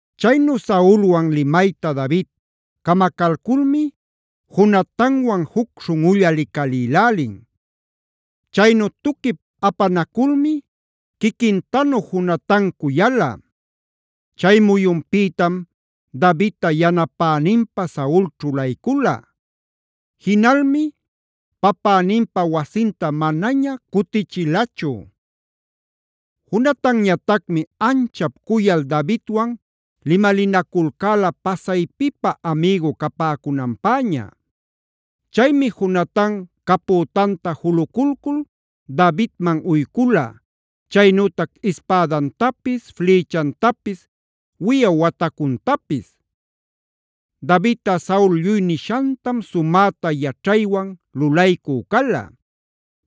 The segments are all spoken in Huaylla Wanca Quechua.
Chaynu Saulwan limayta David camacalculmi Jonatanwan juc śhunꞌulla licalïlälin. Chaynu tuquip apanaculmi quiquintanu Jonatan cuyala. Chay muyunpïtam Davidta yanapäninpä Saul ćhulaycula. Jinalmi papäninpa wasinta manaña cutichilachu. Jonatanñatacmi anchap cuyal Davidwan limalinaculcäla pasaypipä amïgu capäcunanpäña. Chaymi Jonatan capütanta juluculcul Davidman uycula, chaynütac ispädantapis, flïchantapis, wiyaw watacuntapis. Davidꞌa Saul lluy nishantam sumäta yaćhaywan lulaycü cala.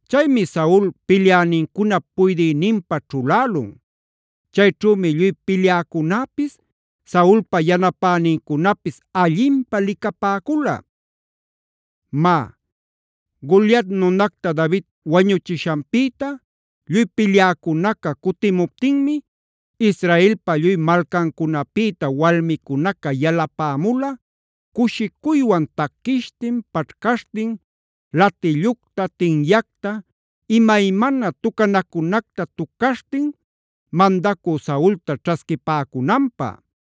Chaymi Saul pilyänincunap puydïninpä ćhulälun. Chayćhümi lluy pilyäcunäpis, Saulpa yanapänincunapis allinpä licapäcula. Má, Goliat nunacta David wañuchishanpïta lluy pilyäcunaca cutimuptinmi Israelpa lluy malcancunapïta walmicunaca yalapämula cushicuywan taquishtin, paćhcaśhtin, latillucta, tinyacta, imaymana tucanacunacta tucaśhtin mandacü Saulta ćhasquipäcunanpä.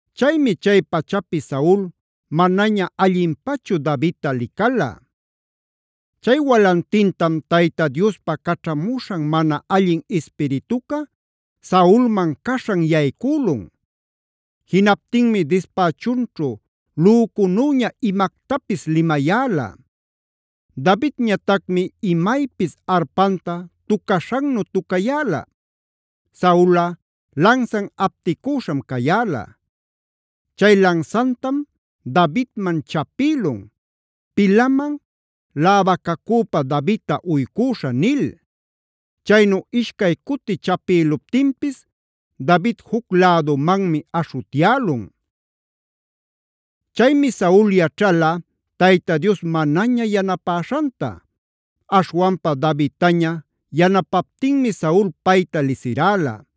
Chaymi chay pachapi Saul manaña allinpachu Davidta licala. Chay walantintam Tayta Diospa caćhamuśhan mana allin ispirituca Saulman caśhan yaycülun. Jinaptinmi dispächunćhu lücunüña imactapis limayäla. Davidñatacmi imaypis arpanta tucaśhannu tucayäla. Saulꞌa lansan apticüśham cayäla. Chay lansantam Davidman chapïlun: “Pilaman läwacacüpa Davidta uycüśhä” nil. Chaynu ishcay cuti chapïluptinpis David juc-lädumanmi aśhutyälun. Chaymi Saul yaćhala Tayta Dios manaña yanapäśhanta; aśhwanpa Davidtaña yanapaptinmi Saul payta lisiräla.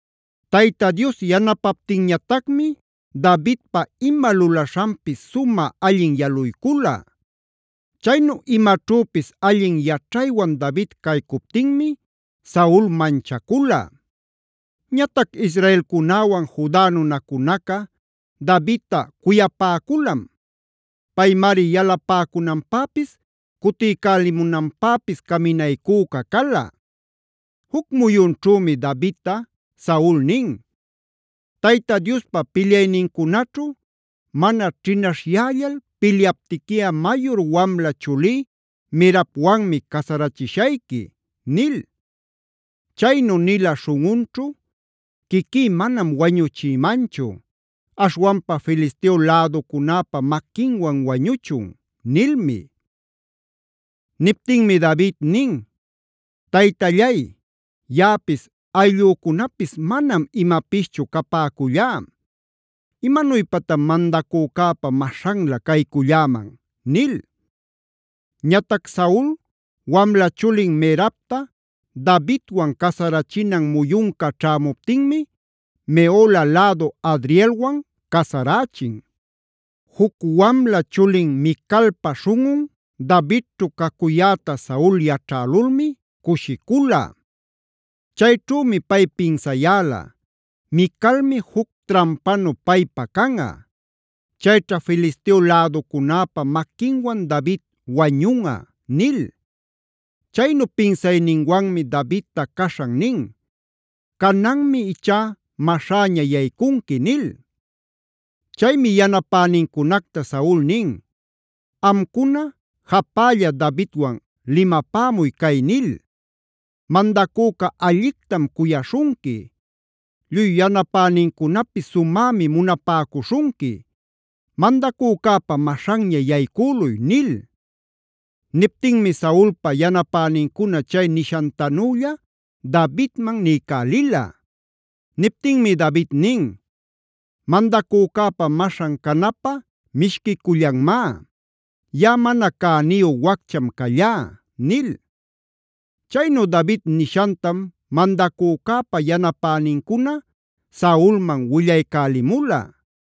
Tayta Dios yanapaptinñatacmi Davidpa ima lulaśhanpis sumä allin yaluycula. Chaynu imaćhüpis allin yaćhaywan David caycuptinmi Saul manchacula. Ñatac israelcunäwan, Juda nunacunaca Davidta cuyapäculam. Paymari yalapäcunanpäpis cutiycälimunanpäpis caminaycüca cala. Juc muyunćhümi Davidta Saul nin: “Tayta Diospa pilyaynincunaćhu mana ćhinaśhyällal pilyaptiquiꞌa mayur wamla chulí Merabwanmi casarachishayqui” nil. Chaynu nila śhunꞌunćhu: “Quiquí manam wañuchïmanchu. Aśhwanpa Filisteo läducunäpa maquinwan wañuchun” nilmi. Niptinmi David nin: “Taytallay, ¿yaꞌapis ayllücunapis manam imapischu capäcullá? ¿Imanuypatan mandacücäpa maśhanlä cayculläman?” nil. Ñatac Saul wamla chulin Merabta Davidwan casarachinan muyunca ćhämuptinmi Mehola lädu Adrielwan casarächin. Juc wamla chulin Micalpa śhunꞌun Davidćhu cacuyäta Saul yaćhälulmi cushicula. Chayćhümi pay pinsayäla: “Micalmi juc trampanu paypä canꞌa. Chayćha Filisteo läducunäpa maquinwan David wañunꞌa” nil. Chaynu pinsayninwanmi Davidta caśhan nin: “Cananmi ichá maśhäña yaycunqui” nil. Chaymi yanapänincunacta Saul nin: “Amcuna japälla Davidwan limapämuy cay nil: ‘Mandacüca allictam cuyaśhunqui; lluy yanapänincunapis sumämi munapäcuśhunqui. Mandacücäpa maśhanña yaycüluy’” nil. Niptinmi Saulpa yanapänincuna chay nishantanülla Davidman niycälila. Niptinmi David nin: “Mandacücäpa maśhan canäpä mishquicullanmá. Yaꞌa mana cäniyu waccham callá” nil. Chaynu David nishantam mandacücäpa yanapänincuna Saulman willaycälimula.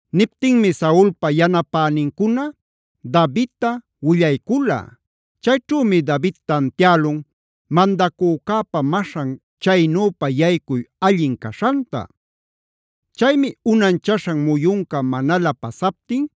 Niptinmi Saulpa yanapänincuna Davidta willaycula. Chayćhümi David tantiälun mandacücäpa maśhan chaynüpa yaycuy allin caśhanta. Chaymi unanchaśhan muyunca manalä pasaptin,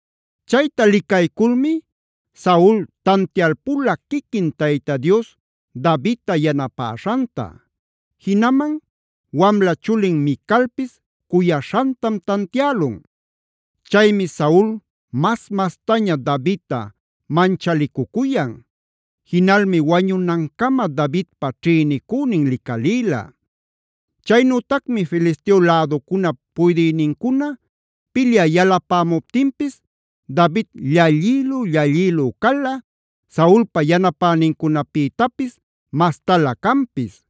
Chayta licayculmi Saul tantialpula quiquin Tayta Dios Davidta yanapäśhanta. Jinaman wamla chulin Micalpis cuyaśhantam tantiälun. Chaymi Saul mas-mastaña Davidta manchalicucuyan. Jinalmi wañunancama Davidpa ćhïnicünin licalïla. Chaynütacmi Filisteo läducunap puydïnincuna pilyä yalapämuptinpis David llallïlü-llallïlü cala, Saulpa yanapänincunapïtapis mastalä canpis.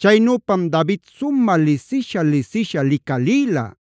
Chaynüpam David sumä lisisha-lisisha licalïla.